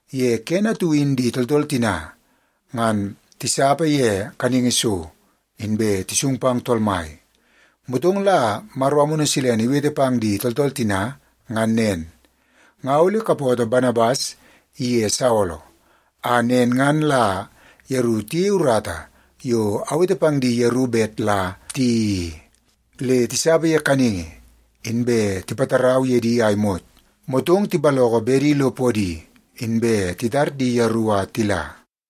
Ye kene atu in di tooltool tina ngan tisapa ye kaningi so, inbe tisung pang Tool Mai. Motong la Maro Amunu Silene iwete pang di tooltool tina ngan nen, “Nga ole kapootoo Banabas iye Saolo, a nen ngan la yeru tiyeie urata yo awete pang di yeru bet la tiyeii i.” Le tisapa ye kaningi, inbe tipatarau ye di a imot, motong tipaloko bedi lo podi, inbe titar di yeru a tila.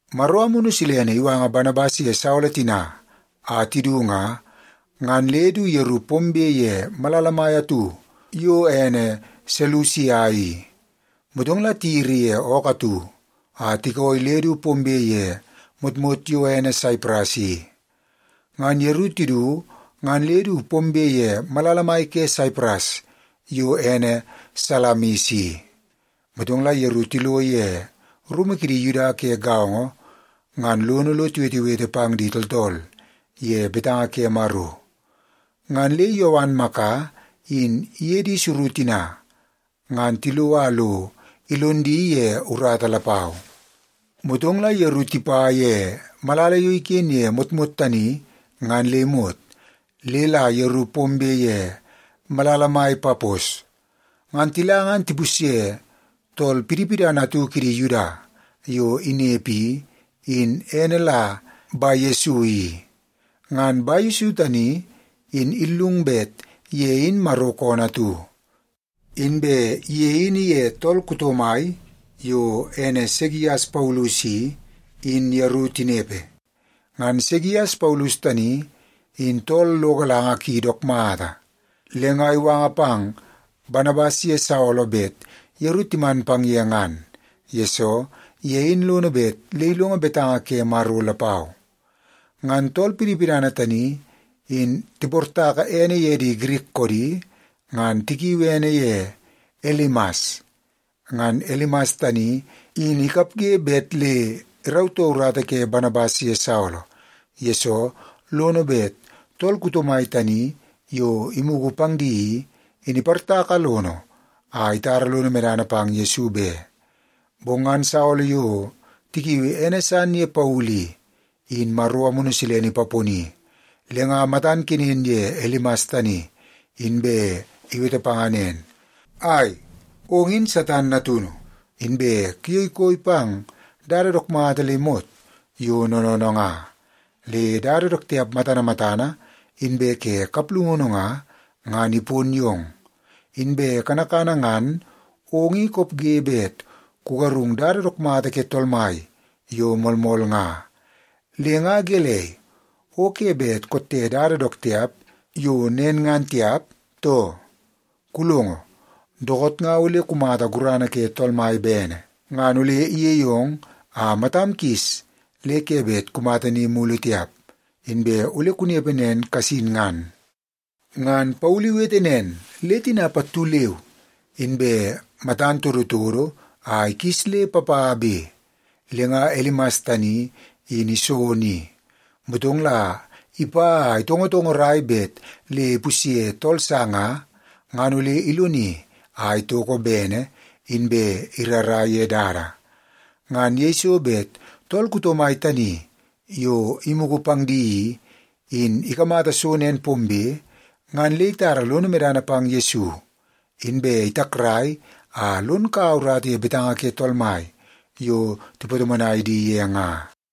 Maro Amunu Silene iwanga Banabas ye Saolo tina a tidu nga, ngan le du yeru pombe ye malala mai atu yo ene Selusia i. Motong la tiyiri ye ookoo atu a tikooi le du pombe ye motmot yo ene Saipras i. Ngan yeru tidu ngan le du pombe ye malala mai ke Saipras yo ene Salamis i. Motong la yeru tilo ye rumu kidi Yuda ke gaongo ngan lono lo tiwetewete pang di tooltool ye betanga ke Maro. Ngan le Yowan Maka in iye di suru tina ngan tilo a lo ilon di ye urata lapau. Motong la yeru tipa ye malala yo iken ye motmot tani ngan le imot, le la yeru pombe ye malala mai Papos. Ngan tila ngan tipusye tool pidipidana atu kidi Yuda yo inepe i, in ene la Bayesu i. Ngan Bayesu tani in illungu bet ye in Maro koonoo atu. Inbe ye in iye tool kuto mai yo ene Segias Paulus i, in yeru tinepe. Ngan Segias Paulus tani in tool lo galanga ki dook mata. Le nga iwanga pang Banabas ye Saolo bet yeru timan pang ye ngan, yesoo ye in lono bet le ilongo betanga ke Maro lapau. Ngan tool pidipidana tani in tiportaka ene ye di Girik koodi, ngan tikiu ene ye Elimas. Ngan Elimas tani in ikapge bet le irautoo urata ke Banabas ye Saolo, yesoo lono bet tool kuto mai tani yo imugu pang di i, in iportaka lono a itara lono medana pang Yesu be. Bong ngan Saolo yo tikiui ene san ye Paulu i, in Maro Amunu Silene ipaponi, le nga matan kenen ye Elimas tani, inbe iwete panga nen, “Ai, ong in Satan natunu, inbe kuyei koi pang dada dook mata le imot yo noonoonoo nga. Le dada dook tiap matana matana, inbe ke kaplungunu nga, ngan ipon yong. Inbe kanakana ngan ong in kopge bet kugarung dada dook mata ke Tool Mai yo moolmool nga. Le nga gelei, o ke bet kotte dada dook tiap yo nen ngan tiap, too? Kulongo, dookoot nga ole kumata gurana ke Tool Mai bene. Ngan ole iyei ong a matam kis le ke bet kumata ni mulu tiap, inbe ole kunepe nen kasin ngan.” Ngan Paulu iwete nen, le tina pattu leu inbe matan todotodo a ikis le papabe. Le nga Elimas tani in iso ni, motong la ipa a itongotongorai bet le ipusye tool sa nga, ngan ole iloni a itoko bene, inbe irara ye dada. Ngan yeiso bet tool kuto mai tani yo imugu pang di i, in ikamata so nen pombe, ngan le itara lono medana pang Yesu. Inbe itakrai a lon kaua urata ye betanga ke Tool Mai yo tipatomonai di ye nga.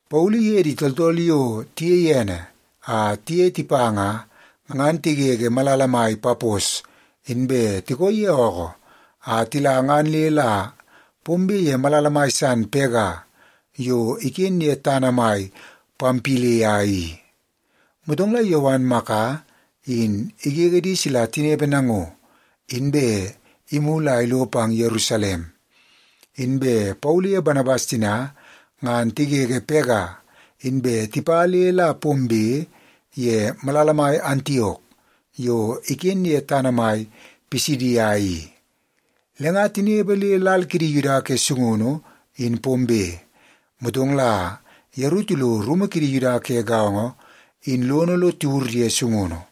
Paulu iye di tooltool yo tiyei ene a tiye tipa nga, ngan tigege malala mai Papos, inbe tikooi ye ookoo a tila ngan le la pombe ye malala mai san Pega yo iken ye tana mai Pampilia i. Motong la Yowan Maka in igege di sila tinepe nango, inbe imulu a ilo pang Yerusalem. Inbe Paulu ye Banabas tina ngan tigege Pega, inbe tipa le la pombe ye malala mai Antiok yo iken ye tana mai Pisidia i. Le nga tinepe le lal kidi Yuda ke sungunu in pombe, motong la yeru tilo rumu kidi Yuda ke gaongo in lono lo tiwur ye sungunu.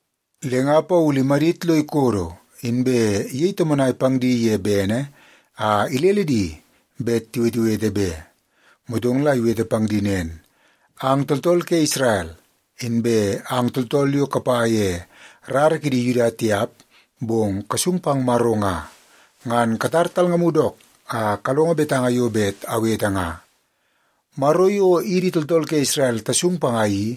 Le nga Paulu imadit lo ikodo, inbe iyei tomonai pang di ye bene a ilele di bet tiwetewete be. Motong la iwete pang di nen, “Ang tooltool ke Isrel, inbe ang tooltool yo kapa ye rara kidi Yuda tiap bong kasung pang Maro nga, ngan katar talngamu dook a kalongo betanga yo bet awete nga. Maro yo idi tooltool ke Isrel tasung panga i,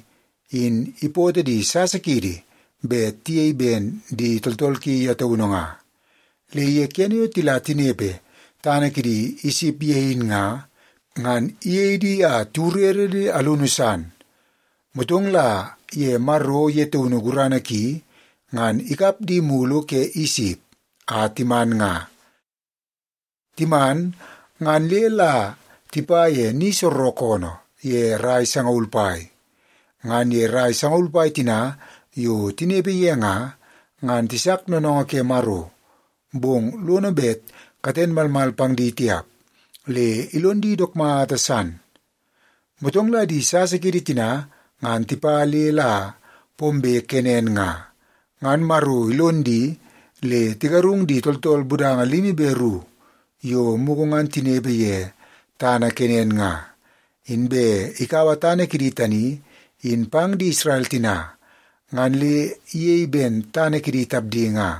in ipootoo di sasa kiidi bet tiyei ben di tooltool ki ye taunu nga. Le ye kene yo tila tinepe tana kidi Isip ye in nga, ngan iyei di a tiwurere le alunu san. Motong la ye Maro ye taunu gurana ki, ngan ikap di mulu ke Isip, a timan nga. Timan, ngan le la tipa ye ni soorookoonoo ye rai sangaul pai. Ngan ye rai sangaul pai tina yo tinepe ye nga, ngan tisak noonoongoo ke Maro, bong lono bet katen malmal pang di tiap, le ilon di dook mata san. Motong la di sasa kiidi tina ngan tipa le la pombe Kenan nga, ngan Maro ilon di le tigarung di tooltool budanga limi be ru yo mugu ngan tinepe ye tana Kenan nga, inbe ikaua tana kidi tani in pang di Isrel tina ngan le iyei ben tana kidi tapdi nga.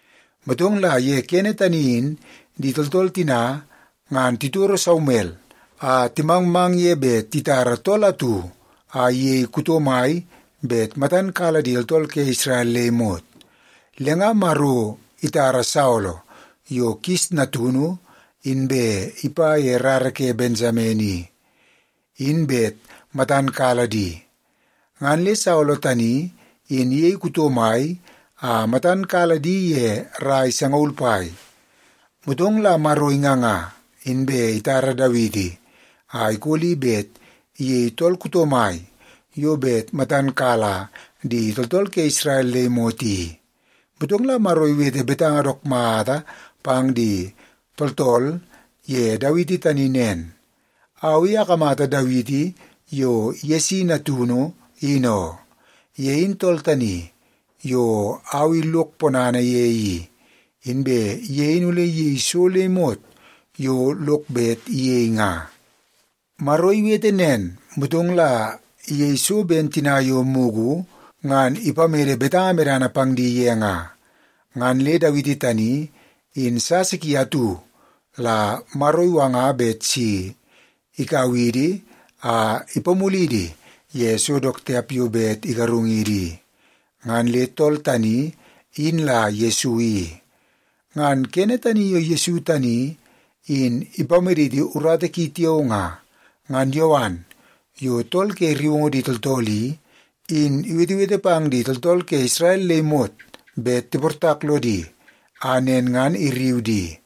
Motong la ye kene tani in di tooltool tina ngan titoro Saumel a timangmang ye bet titara tool atu a iyei kuto mai bet matan kala di tooltool ke Isrel le imot. Le nga Maro itara Saolo yo Kis natunu inbe ipa ye rara ke Bensamen i, in bet matan kala di. Ngan le Saolo tani in iyei kuto mai a matan kala di ye rai sangaul pai. Motong la Maro inganga, inbe itara Dawiti a ikoli bet iyei tool kuto mai yo bet matan kala di tooltool ke Isrel le imot i. Motong la Maro iwete betanga dook mata pang di tooltool ye Dawiti tani nen, ‘Au i akamata Dawiti yo Yesi natunu, in oo. Ye in tool tani yo au i lok ponana ye i, inbe ye in ole iyei so le imot yo lok bet iyei nga.’ “Maro iwete nen, motong la iyei so ben tina yo mugu ngan ipamede betanga medana pang di ye nga. Ngan le Dawiti tani in sasa ki atu la Maro iwanga bet si ikau idi a ipamulidi ye so dook tiap yo bet igarungidi i. Ngan le tool tani, in la Yesu i. Ngan kene tani yo Yesu tani in ipamaditi urata ki tiao nga, ngan Yowan yo tool ke rriungu di tooltool i, in iwetewete pang di tooltool ke Isrel le imot bet tiportak lodi, a nen ngan irriu di.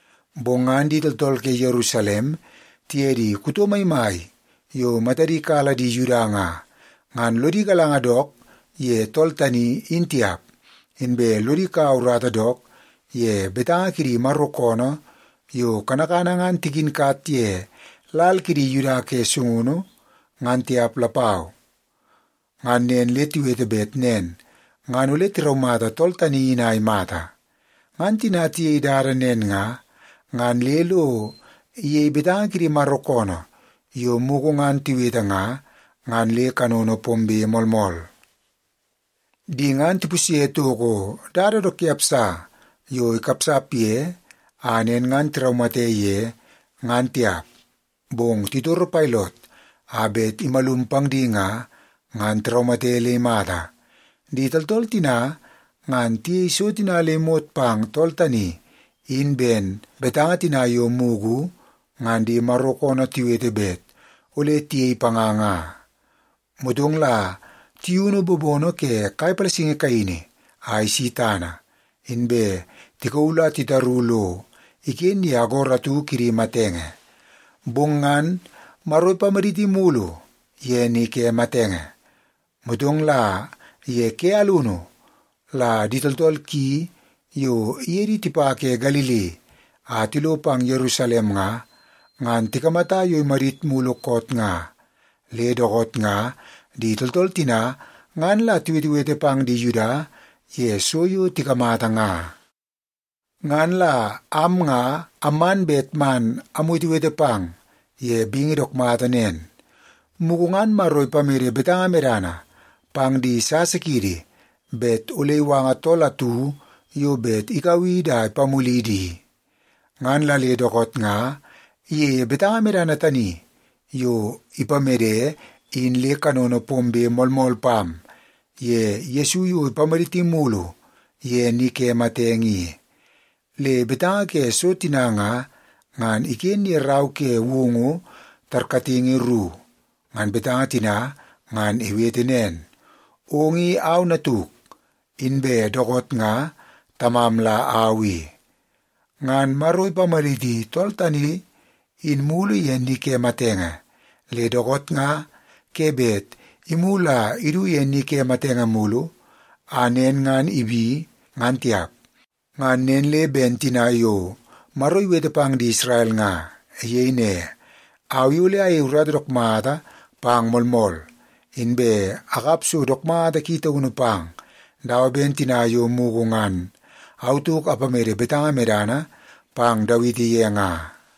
Bong ngan di tooltool ke Yerusalem tiye di kuto maimai yo matadi kala di Yuda nga, ngan lodi galanga dook ye tool tani, in tiap. Inbe lodi kaua urata dook ye betanga kidi Maro koonoo yo kanakana ngan tikinkat ye lal kidi Yuda ke sungunu, ngan tiap lapau. Ngan nen le tiwete bet nen ngan ole tiraumata tool tani in a imata. Ngan tina tiyei dada nen nga, ngan le lo iyei betanga kidi Maro koonoo yo mugu ngan tiwete nga, ngan le kanono pombe moolmool. Di ngan tipusye toko dada dook tiap sa yo ikapsap ye a nen ngan tiraumate ye, ngan tiap. Bong titoro Pailot a bet imalum pang di nga, ngan tiraumate le imata. Di tooltool tina ngan tiyei so tina le imot pang tool tani in ben betanga tina yo mugu ngan di Maro koonoo tiwete bet ole tiyei panga nga. Motong la tiyunu bobono ke kai palasingi kaini a isi tana, inbe tikauu la titaru lo iken ye agoro atu kidi matenge. Bong ngan Maro ipamaditi mulu ye ni ke matenge. Motong la ye ke alunu la di tooltool ki yo iye di tipa ke Galili a tilo pang Yerusalem nga, ngan tikamata yo imadit mulu koot nga. Le dookoot nga di tooltool tina ngan la tiwetewete pang di Yuda ye so yo tikamata nga. “Ngan la am nga amman bet man amwetewete pang ye bingi dook mata nen. Mugu ngan Maro ipamede betanga medana pang di sasa kiidi bet ole iwanga tool atu yo bet ikau idi a ipamulidi i, ngan la le dookoot nga iyeie betanga medana tani yo ipamede in le kanono pombe moolmool pam ye Yesu yo ipamaditi mulu ye ni ke matenge i. Le betanga ke so tina nga, ngan iken ye rau ke Woungu tarkatingi ru. Ngan betanga tina ngan iwete nen, ‘Ong i au Natuk, inbe dookoot nga Tamam la au i.’ Ngan Maro ipamaditi tool tani in mulu ye ni ke matenge, le dookoot nga ke bet imulu a idu ye ni ke matenge mulu a nen ngan ibi, ngan tiap. Ngan nen le ben tina yo Maro iwete pang di Isrel nga. Iyei ne, ‘Au i ole ayei urata dook mata pang moolmool, inbe akap so dook mata ki taunu pang, dawa ben tina yo mugu ngan au tauk apamede betanga medana pang Dawiti ye nga.’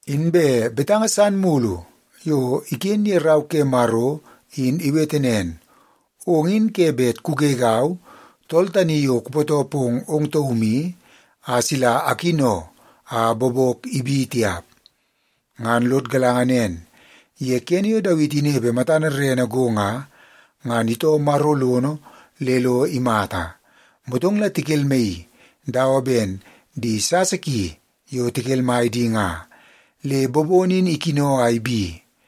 Inbe betanga san mulu yo iken ye rau ke Maro in iwete nen, ‘Ong in ke bet kugegau, Tool Tani Yo Kupootoo Pong Ong Taum I, a sila akino a bobok ibi tiap.’ “Ngan lod galanga nen, ye kene yo Dawiti inepe matana rerene go nga, ngan itoo Maro lono le lo imata. Motong la tikelmaii dawa ben di sasa ki yo tikelmai di nga, le bobono in ikino a ibi.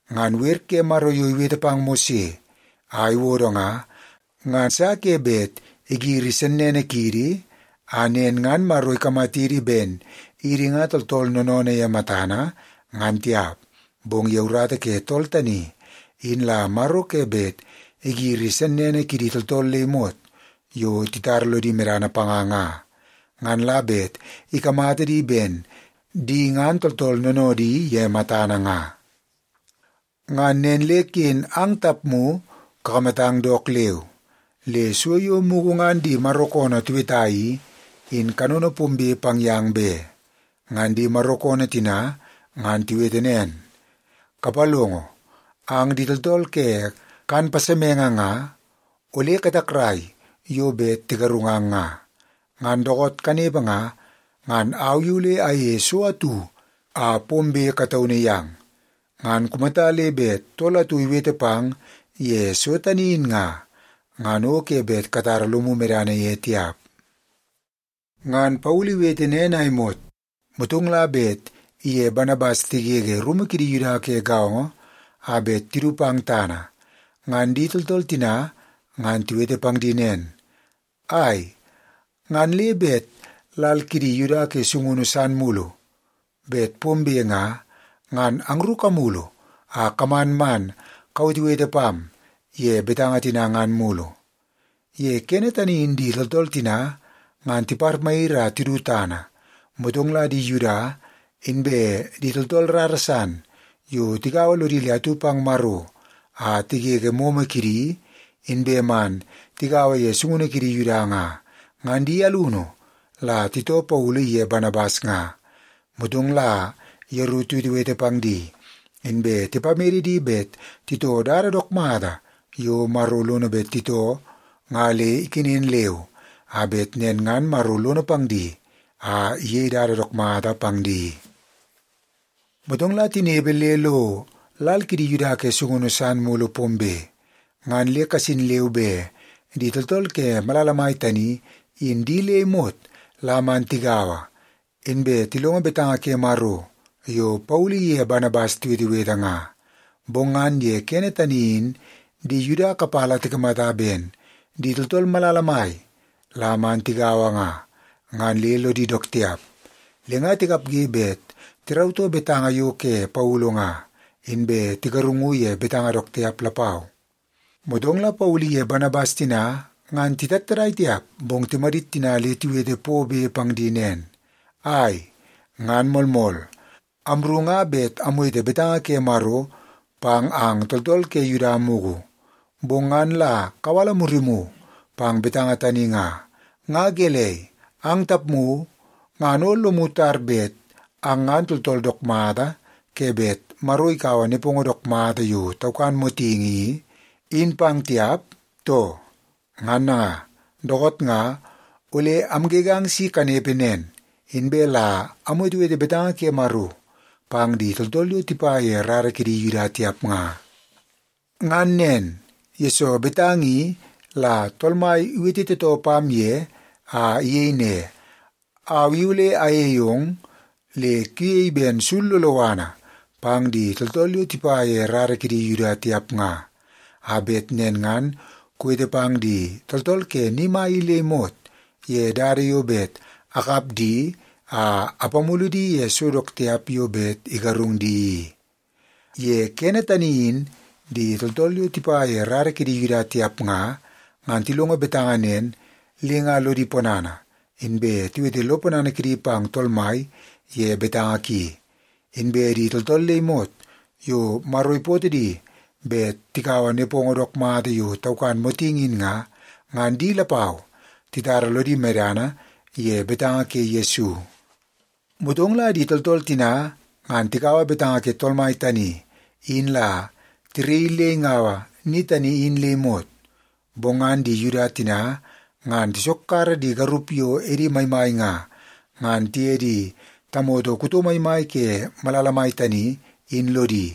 Ngan wer ke Maro yo iwete pang Mose a iwodo nga, nga sa ke bet igiri sennene kiidi, a nen ngan Maro ikamatidi ben idi nga tooltool noonoodoo ye matana, ngan tiap. Bong ye urata ke tool tani in la Maro ke bet igiri sennene kidi tooltool le imot yo titara lodi medana panga nga, ngan la bet ikamata di ben di ngan tooltool noonoodi ye matana nga. Ngan nen le ken ang tapmu kakamatang dook leu, le so yo mugu ngan di Maro koonoo tiweta i, in kanono pombe pang yang be. Ngan di Maro koonoo tina ngan tiwete nen, ‘Kapalongo! Ang di tooltool ke kan pasemenge nga, ole katakrai yo bet tigarungang nga. Ngan dookoot kanepe nga, ngan au i ole ayeie so atu a pombe kataunu yang. Ngan kumata le bet tool atu iwete pang ye so tani in nga, ngan o ke bet katara lomu medana ye tiap.’” Ngan Paulu iwete nen a imot, motong la bet iye Banabas tigege rumu kidi Yuda ke gaongo a bet tidu pang tana, ngan di tooltool tina ngan tiwete pang di nen, “Ai, ngan le bet lal kidi Yuda ke sungunu san mulu bet pombe nga, ngan angru kamulu a kaman man kawetewete pam ye betanga tina ngan mulu.” Ye kene tani in di tooltool tina ngan tiparmayiri a tidu tana, motong la di Yuda, inbe di tooltool rara san yo tigaua lodi le atu pang Maro a tigege momo kidi, inbe man tigaua ye sungunu kidi Yuda nga, ngan di alunu la titoo Paulu iye Banabas nga. Motong la yeru tiwetewete pang di, inbe tipamede di bet titoo dada dook mata yo Maro lono bet titoo nga le ikenen leu, a bet nen ngan Maro lono pang di a iyei dada dook mata pang di. Motong la tinepe le lo lal kidi Yuda ke sungunu san mulu pombe, ngan le kasin leu be di tooltool ke malala mai tani in di le imot la man tigaua, inbe tilongo betanga ke Maro yo Paulu iye Banabas tiwetewete nga. Bong ngan ye kene tani in di Yuda kapala tikamata ben di tooltool malala mai la man tigaua nga, ngan le lodi dook tiap. Le nga tikapge bet tirautoo betanga yo ke Paulu nga, inbe tigarungu ye betanga dook tiap lapau. Motong la Paulu iye Banabas tina ngan titattadai tiap, bong timadit tina le tiwete pobe pang di nen, “Ai! Ngan moolmool, amru nga bet amwete betanga ke Maro pang ang tooltool ke Yuda mugu, bong ngan la kawala murimu pang betanga tani nga. Nga gelei, ang tapmu ngan o lomu tar bet ang ngan tooltool dook mata ke bet Maro ikaua nepongo dook mata yo taukan motingi i, in pang tiap, too? Ngan nanga, dookoot nga ole amgegang si kanepe nen, inbe la amwetewete betanga ke Maro pang di tooltool yo tipa ye rara kidi Yuda tiap nga. Ngan nen, yesoo betanga i la Tool Mai iwete tootoo pam ye a iyei ne, ‘Au i ole ayei ong le kuyei ben sul loloana pang di tooltool yo tipa ye rara kidi Yuda tiap nga, a bet nen ngan kuwete pang di tooltool ke ni mai i le imot ye dada yo bet akap di a apamulu di ye so dook tiap yo bet igarung di i.’” Ye kene tani in di tooltool yo tipa ye rara kidi Yuda tiap nga, ngan tilongo betanga nen, le nga lodi ponana, inbe tiwete lo ponana kidi pang Tool Mai ye betanga ki. Inbe di tooltool le imot yo Maro ipootoo di bet tikaua nepongo dook mata yo taukan motingi in nga, ngan di lapau titara lodi medana ye betanga ke Yesu. Motong la di tooltool tina ngan tikaua betanga ke Tool Mai tani in la tiraii le ingaua ni tani in le imot. Bong ngan di Yuda tina ngan tisokkara di garup yo edi maimai nga, ngan tiye di tamoto kuto maimai ke malala mai tani, in lodi.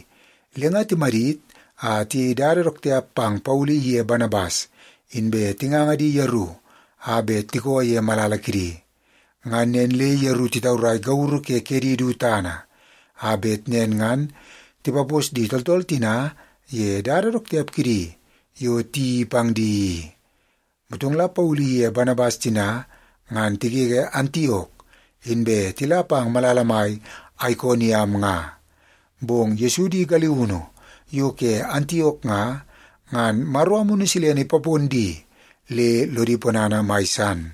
Le nga timadit a tiyei dada dook tiap pang Paulu iye Banabas, inbe tinganga di yeru a bet tikoo ye malala kidi. Ngan nen le yeru titaurai gauru ke kedi du tana, a bet nen tipapos di tooltool tina ye dada dook tiap kidi yo tiyeii pang di i. Motong la Paulu iye Banabas tina ngan tigege Antiok, inbe tila pang malala mai Aikoniam nga. Bong Yesu di galiunu yo ke Antiok nga, ngan Maro Amunu Silene ipapon di le lodi ponana mai san.